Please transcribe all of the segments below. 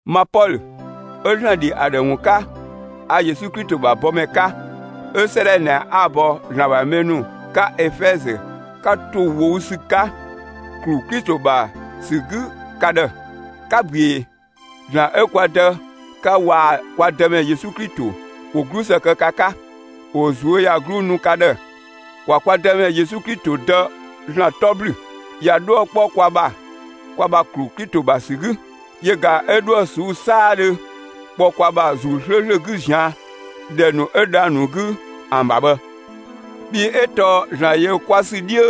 Ma Pɔlö 'ö ‑Zlan ‑dhi ‑a ‑dhë ‑wun 'ka, 'a Yesu Klito ‑bha bɔmɛ 'ka, 'ö 'sëëdhɛ ꞊nɛ 'a‑ bɔ ‑Zlan ‑bha mɛ ‑nu 'ka Efɛzö 'ka ‑to ꞊wou' ‑sü 'ka, ‑klu Klito ‑bha ‑sü 'gü ka ‑dhë. 'Ka ꞊büee! ‑Zlan 'ö kwa Dë 'ka waa‑ kwa Dëmɛ Yesu Klito ‑wo 'glusë kë ka 'ka, ‑wo ꞊zuöyagluu nu ka ‑dhë. ‑Kwa kwa Dëmɛ Yesu Klito Dë ‑Zlan 'tɔ ‑blü! ꞊Ya 'dhuë‑ 'kpɔ kwa ‑bha kwa ‑bha ‑klu Klito ‑bha ‑sü 'gü; yö ꞊ga 'ö 'dhuë‑ ꞊suu'‑ 'saadhö kpɔ kwa ‑bha ‑Zuu 'slööslö 'gü ꞊zian' ‑dhɛ ‑nu 'wo dhang‑ ‑nu 'gü ‑an ‑bha bhë. Bhii 'ö tɔɔ ‑Zlan ‑yö kwa ‑sü 'dhiö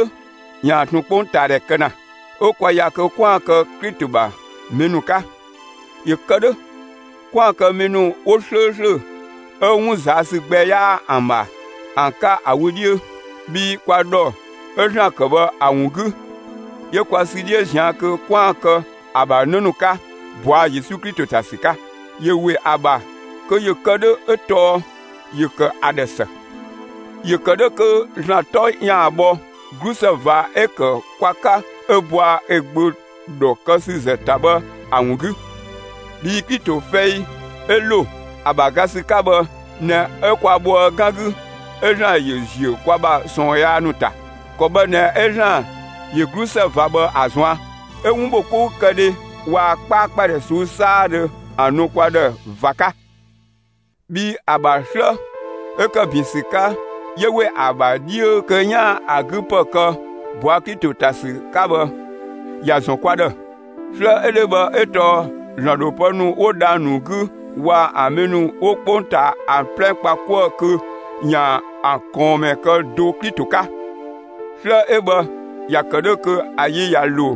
‑yaan ꞊tun 'kpongtaadhɛ kë ‑na; 'ö kwa ‑ya kö 'kwaan‑ kë Klito ‑bha mɛ ‑nu 'ka, ‑yö kë 'dhö 'kwaan‑ kë mɛ ‑nu 'wo 'slööslö 'ö 'wun ꞊zaa' ‑sü gbɛ 'yaa ‑an ‑bha ‑an 'ka ‑a wö 'dhiö. Bhii kwa ‑dhɔ 'ö ‑Zlan ‑kë bhë ‑a ‑wun 'gü, 'yö kwa sü 'dhiö ꞊zian' kö 'kwaan‑ kë ‑a ‑bha 'në ‑nu 'ka ꞊bɔa' Yesu Klito ‑ta ‑sü 'ka; ‑yö ‑we ‑a ‑bha kö ‑yö kë 'dhö 'ö tɔɔ ‑yö ‑kë ‑a ‑dhë ‑së. ‑Yö kë 'dhö kö ‑Zlan 'tɔ ‑yaan bhɔ 'glusë ꞊va 'ö‑ ‑kë kwa 'ka 'ö bɔa ö Gbö ‑dhɔkësüzë ‑ta bhë ‑a ‑wun 'gü. Bhii Klito fɛi 'ö ‑lo ‑a ‑bha ga ‑sü 'ka bhë ꞊nɛ 'ö kwa bhoë 'gan 'gü 'ö ‑Zlan ‑yö ‑ziö kwa ‑bha ꞊sɔɔn yaa ‑nu ‑ta. ‑Kɔ bhë ꞊nɛ 'ö ‑Zlan ‑yö 'glusë ꞊va bhë ‑a ꞊zuan', 'ö 'wun ‑bho 'koukëdhe waa‑ 'kpaakpadhɛ ꞊suu'‑ 'saadhö ‑an nu kwa ‑dhë ꞊va 'ka. Bhii ‑a ‑bha 'slë 'ö ‑kë ‑bin ‑sü 'ka 'yö ‑we ‑a ‑bha 'dhiö kö 'yaan‑ ‑a 'gü ‑pë kë ꞊bɔa' Klito ‑ta ‑sü 'ka bhë, ‑ya ‑zɔn kwa ‑dhë. 'Slë 'ö 'dhö bhë 'ö tɔɔ ‑Zlan ‑dho pë ‑nu 'wo dhang‑ ‑nu 'gü waa‑ ‑an mɛ ‑nu 'wo 'kpongtaa ‑an 'plɛ kpa 'kuë‑ kö ‑yaan ‑an ꞊kɔɔnmɛ kë do Klito 'ka. 'Slë 'ö bhë ‑ya ‑kë 'dhö kö ‑a yi ꞊ya ‑lo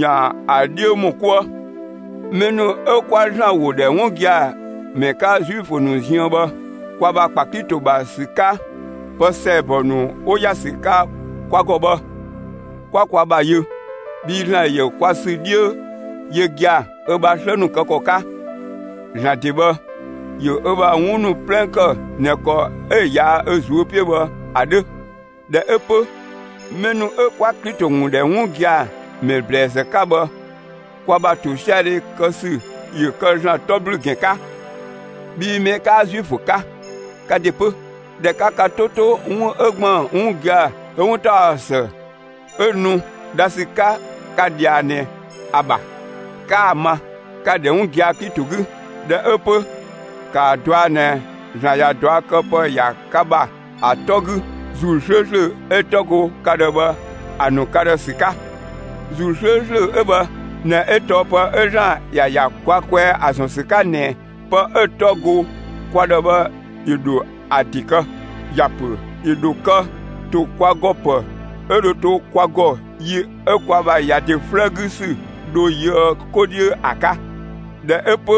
‑yaan ‑a 'dhiö ‑mɔ 'kuë. Mɛ ‑nu 'ö 'kwa ‑Zlan ‑wo ‑dhɛ 'wun gia‑ ‑mɛ 'ka Zuifö ‑nu ziën bhë, kwa ‑bha ‑kpa Klito ‑bha ‑sü 'ka, pë ‑sɛɛbɔ ‑nu 'wo ‑ya ‑sü 'ka kwa ‑gɔ bhë 'kwa kwa ‑bha yö. Bhii ‑Zlan ‑yö kwa ‑sü 'dhiö yö gia‑ ö ‑bha 'slë ‑nu kë ‑kɔ 'ka; ‑Zlan ‑de bhë, ‑yö ö ‑bha 'wun ‑nu 'plɛ ‑kë ꞊nɛ ‑kɔ 'ö‑ ꞊yaa' ö ꞊zuö' 'piö bhë ‑a 'dhö. ꞊Dhɛ 'ö 'pö, mɛ ‑nu 'ö 'kwa Klito ‑wun ‑dhɛ 'wun gia‑ ‑mɛ ‑blɛɛzë 'ka bhë kwa ‑bha ‑tosiadhe kë ‑sü ‑yö kë ‑Zlan 'tɔ ‑blü ‑gɛn 'ka! Bhii mɛ 'kaa Zuifö 'ka, ka ‑de 'pö, ꞊dhɛ 'ka ka 'to 'to 'wun 'ö ‑gban 'wun gia‑ 'ö 'wuntaɔsë 'ö nu dha ‑sü 'ka ka ꞊dhia ꞊nɛ ‑a ‑bha, 'ka‑ ma, ka‑ ‑dhɛ 'wun gia‑ Klito 'gü. ꞊Dhɛ 'ö 'pö ‑kaa dɔa ꞊nɛ ‑Zlan ꞊ya ꞊duakëpë ‑ya ka ‑bha ‑a 'tɔ 'gü ‑Zuu 'slööslö 'ö‑ 'tɔ go ka ‑dhë bhë ‑a ‑nu ka ‑dhë ‑sü 'ka. ‑Zuu 'slööslö 'ö bhë ꞊nɛ 'ö tɔɔ pë 'ö ‑Zlan ‑ya ‑ya kwa kwɛɛ ‑a ‑zɔn ‑sü 'ka ꞊nɛ pë 'ö‑ 'tɔ go kwa ‑dhë bhë ‑yö ‑dho ‑a ‑de kë. ‑Ya ‑pö ‑yö ‑dho kë ‑to kwa ‑gɔ ‑pë 'ö dho to kwa ‑gɔ yi 'ö kwa ‑bha ‑ya ‑de 'flëë 'gü ‑sü dho yöë 'ko 'dhiö ‑a 'ka. ꞊Dhɛ 'ö 'pö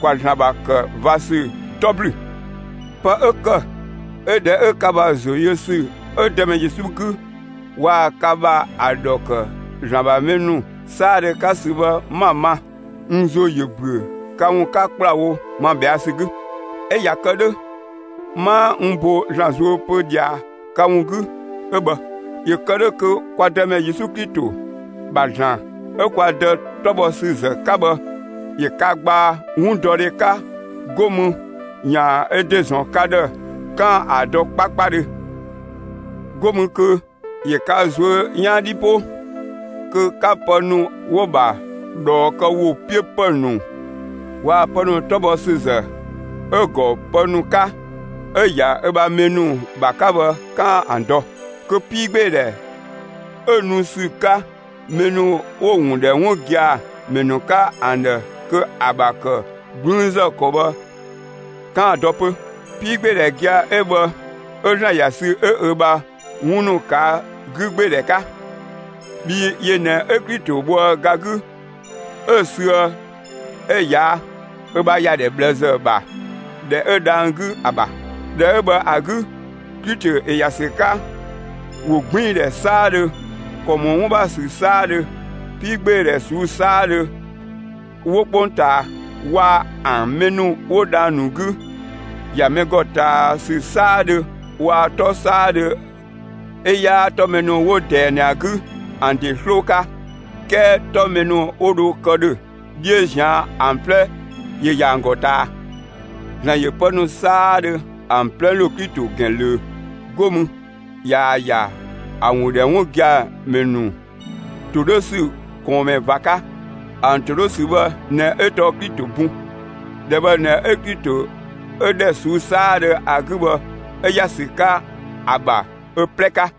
‑kwa ‑Zlan ‑bha ‑kë ꞊va ‑sü 'tɔ ‑blü! Pë 'ö ‑kë 'ö ꞊dhɛ 'ö ka ‑bha ‑zo yö ‑sü 'ö Dëmɛ Yesu 'gü waa‑ ka ‑bha ‑a ‑dhɔ ‑kë ‑Zlan ‑bha mɛ ‑nu 'saadhö 'ka ‑sü bhë 'ma‑ ma, n ‑zo ‑yö ‑büö ka ‑wun 'ka ‑kplawo ma ꞊bhɛa' ‑sü 'gü, 'ö ꞊ya kë 'dhö, 'maa n bo ‑Zlan zuö pö ꞊dhia ka ‑wun 'gü 'ö bhë. ‑Yö kë 'dhö kö kwa Dëmɛ Yesu Klito ‑bha ‑Zlan 'ö kwa Dë 'tɔ bhɔ ‑sü ‑zë 'ka bhë ‑yö ka gbaa 'wundɔdhe 'ka 'go mü ‑yaan ö ‑de ‑zɔn ka ‑dhë 'kaan‑ ‑a dɔ 'kpakpadhö. 'Go mü kö ‑yö ka ꞊zuö' 'yan 'dhi 'po, kö 'ka pë ‑nu 'wo‑ ‑bha ꞊dhɔɔ kë ‑wo 'piö ‑pë ‑nu waa‑ pë ‑nu 'tɔ bhɔ ‑sü ‑zë 'ö‑ ‑gɔ pë ‑nu 'ka 'ö‑ ‑ya ö ‑bha mɛ ‑nu ‑bha 'ka bhë 'kaan‑ ‑an dɔ, kö 'piigbeedhɛ 'ö nu ‑sü 'ka mɛ ‑nu 'wo‑ ‑wun ‑dhɛ 'wun gia‑ ‑mɛ ‑nu 'ka ‑an ‑dhë kö ‑a ‑bha ‑kë 'gblüünzë ‑kɔ bhë 'kaan‑ ‑dɔ 'pö. 'Piigbeedhɛ gia‑ 'ö bhë 'ö ‑Zlan ‑ya sü 'ö ö ‑bha 'wun ‑nu ꞊kaa' 'gügbeedhɛ 'ka. Bhii yö ꞊nɛ 'ö Klito bhoë ga 'gü 'ö‑ süë, 'ö‑ ꞊yaa' ö ‑bha ‑yadhɛ ꞊bhlëzë ‑bha ‑dhɛ 'ö dhang‑ 'gü ‑a ‑bha. ‑Dhɛ 'ö bhë ‑a 'gü, Klito ‑yö ‑ya ‑sü 'ka ‑wogbiindhɛ 'saadhö, ‑kɔ ‑mɔ 'wun ‑bha ‑sü 'saadhö, 'piigbeedhɛ ꞊suu'‑ 'saadhö 'wo 'kpongtaa waa‑ ‑an mɛ ‑nu 'wo dhang‑ ‑nu 'gü, ‑ya mɛ ‑gɔ ꞊taa ‑sü 'saadhö waa‑ 'tɔ 'saadhö 'ö 'yaa 'tɔ mɛ ‑nu 'wo ꞊dɛɛ ꞊nɛ ‑a 'gü ‑an ‑de 'sloo 'ka 'kɛɛ 'tɔ mɛ ‑nu 'wo dho kë ‑dhö 'dhiö ꞊zian' ‑an 'plɛ ‑yö ‑ya ‑an ‑gɔ ꞊taa. ‑Zlan ‑yö pë ‑nu 'saadhö ‑an 'plɛ ‑lo Klito ‑gɛn ꞊löö; 'go mü ꞊yaa‑ ‑ya ‑a ‑wun ‑dhɛ 'wun gia‑ ‑mɛ ‑nu ‑to 'dhö ‑sü ꞊kɔɔnmɛ ꞊va 'ka. ‑An ‑to 'dhö ‑sü bhë ꞊nɛ 'ö tɔɔ Klito bun; ‑dhɛ bhë ꞊nɛ 'ö Klito 'ö ‑dhɛ ꞊suu'‑ 'saadhö ‑a 'gü bhë 'ö ‑ya ‑sü 'ka ‑a ‑bha ö 'plɛ 'ka.